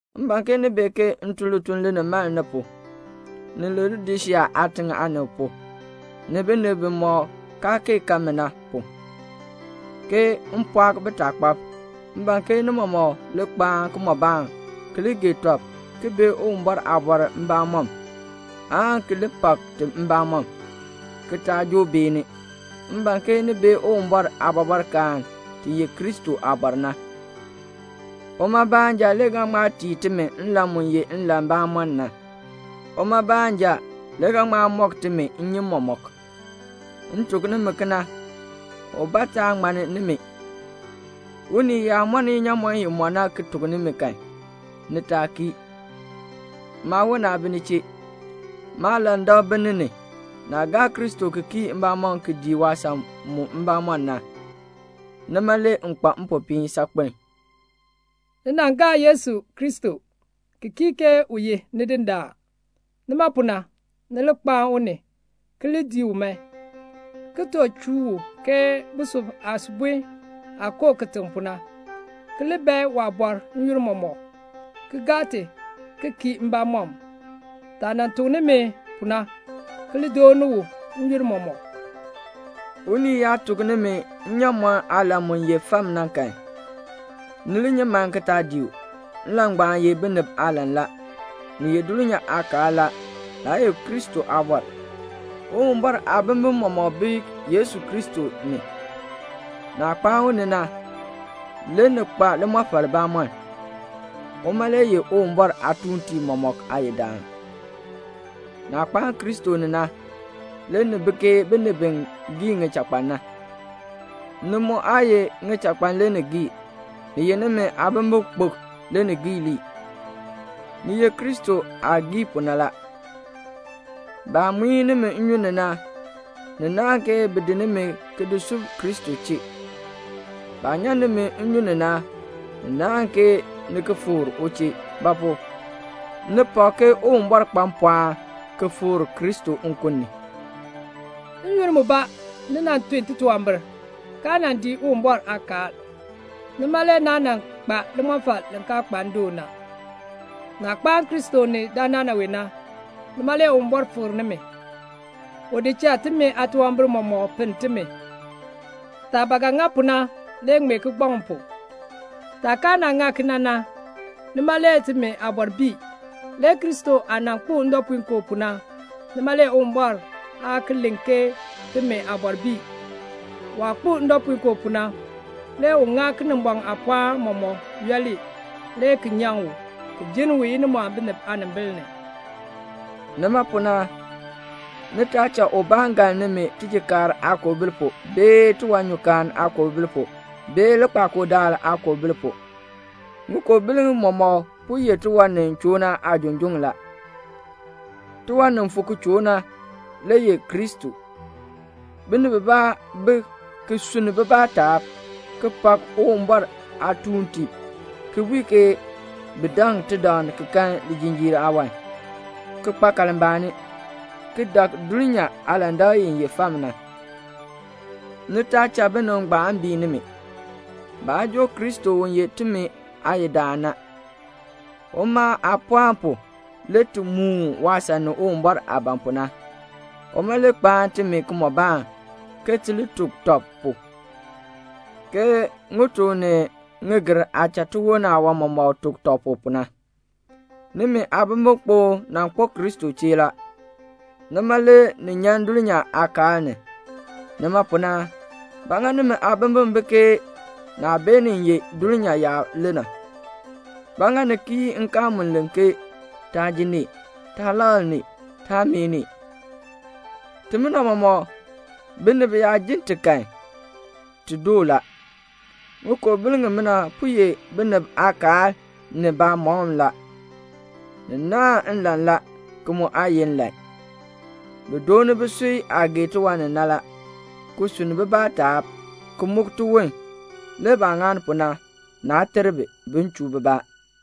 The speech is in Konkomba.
M ban ke ni bee ke m tun lituln linimaln nimi pu, ni Laodisea aatiŋ aanib pu, ni binib bimɔk kaa kee kan mi na pu, ke m pɔɔk bitaakpab. M ban ke ni mɔmɔk li kpaan kimɔbaan, ki li gee tɔb, ki bee Uwumbɔr aabɔr mbamɔm, aan ki li pak ti mbamɔm, ki taa joo beeni. M ban ke ni bee Uwumbɔr aabɔbɔrkaan, ti ye Kristo aabɔr na. Uma baanja le ga ŋma tii timi nlan mu ye nlan bamɔnn na. Uma baanja le ga ŋma mɔk timi nnyim mɔmɔk. M tuk nimi kena, ubaa taa ŋmann nimi. Unii yaa mɔn inyaamɔn i mɔ na ki tuk nimi kan, ni taa kii. Maawon aa bi ni chee. Maalandak bi ni ni. Naah gaa Kristo ki kii mbamɔm ki dii waasan mu mbamɔm na, nima le m kpa mpopiin saakpen a. Ni nan gaa Yesu Kristo, ki kii ke u ye Nidindaan. Nima pu na, ni li kpaan u ni, ki li dii u man, ki too chuu u ke busub aasubon aah koo kitiŋ pu na, ki li bae waabɔr n-yoonn mɔmɔk, ki gaa ti ki kii mbamɔm, taah nan tuk nimi pu na, ki li dooni u n-yoonn mɔmɔk. Unii yaa tuk nimi nnyaamɔn aalan mu ye fam na kan, ni li nyi man ki taa dii u; nlan ngbaan ye binib aalan la. Ni ye dulnyaa aakaal la, naa ye Kristo aabɔr. Uwumbɔr aabimbin mɔmɔk bi Yesu Kristo ni. Naah kpaan u ni na, le ni kpa limɔfal bamɔln. Uma le ye Uwumbɔr aatuuntiib mɔmɔk aayidaan. Naah kpaan Kristo ni na, le ni bi ke binib bi gii ŋichakpan na; ni mu aa ye ŋichakpan le ni gii, ni ye nimi aabimbikpok le ni gii lii. Ni ye Kristo aah gii pu na la. Baah muin nimi nnyun ni na, ni naahn ke bi di nimi ki di sub Kristo chee. Baah nyan nimi nnyun ni na, ni naahn ke ni ki fikr u chee; ba pu? ni pak ke Uwumbɔr kpa mpɔɔn ki fikr Kristo nkun ni. N-yoonn mbaa ni nan tun titunwambir, kaa nan dii Uwumbɔr aakaal. Nima le naa nan kpa limɔfal li kaa kpa ndoon na. Naah kpaan Kristo ni dandana wee na, nima le Uwumbɔr fikr nimi. U di cha timi aatunwambir mɔmɔk pinn timi. Taah ba ga ŋa pu na le ŋmee kigbaŋ pu. Taah kaa ŋa kena na, nima le timi aabɔr bii. Le Kristo aah nan kpo ndɔpuinkoo pu na, nima le Uwumbɔr aa ki len ke timi aabɔr bii. Waah kpo ndɔpuinkoo pu na, le u ŋa Kinimbɔŋ aapɔɔn mɔmɔk yooli, le ki nyaŋ u, ki jinn u inimɔɔn binib aanimbil ni. Nima pu na, ni taa cha ubaa galn nimi tijikaar aakoobil pu, bee tiwanyukaan aakoobil pu, bee likpakool daal aakoobil pu. Ŋikoobil mɔmɔk po ye tiwan ni choo na aajunjuŋ la. Tiwan ni fu ki choo na le ye Kristo. Binib bibaa bi ki sunni bibaa taab, ki pak Uwumbɔr aatuuntiib, ki bui ke bi daŋ tidaŋ ki kan lijinjiir aawan, ki kpa kalmbaani, ki dak dulnyaa aalandak i ye fam na. Ni taa cha binib ngbaan bii nimi. Baa joo Kristo u ye timi aayidaan. Uma aapɔɔn pu le ti muun waasan ni Uwumbɔr aah ban pu na. Uma le kpaan timi kimɔbaan, ke ti li tuk tɔb pu, ke ŋituk ni ŋigir aah cha tiwon aawan mɔmɔk tuk tɔb pu, pu na. Nimi aabimbikpok nan kpo Kristo chee la, nima le ni nyan dulnyaa aakaal ni. Nima pu na, ba ŋa nimi aabimbin bi ke naah beenin ye dulnyaa yaab le na? Ba ŋa ni kii nkaal mu len ke "Taa ji nee," "Taa lakl nee," "Taa meeh nee"? Timina mɔmɔk, binib yaa ji ti kan, ti doo la. Ŋikoobil ŋimina po ye binib aakaal ni baamɔkm la. Ni naahn nlan la, ki mu aa ye nlan. Bi dooni bisui aah gee tiwan ni na la, ki sunn bibaa taab, ki muk tiwon. Le baah ŋani pu na, naa ter bi, bin chuu bibaa.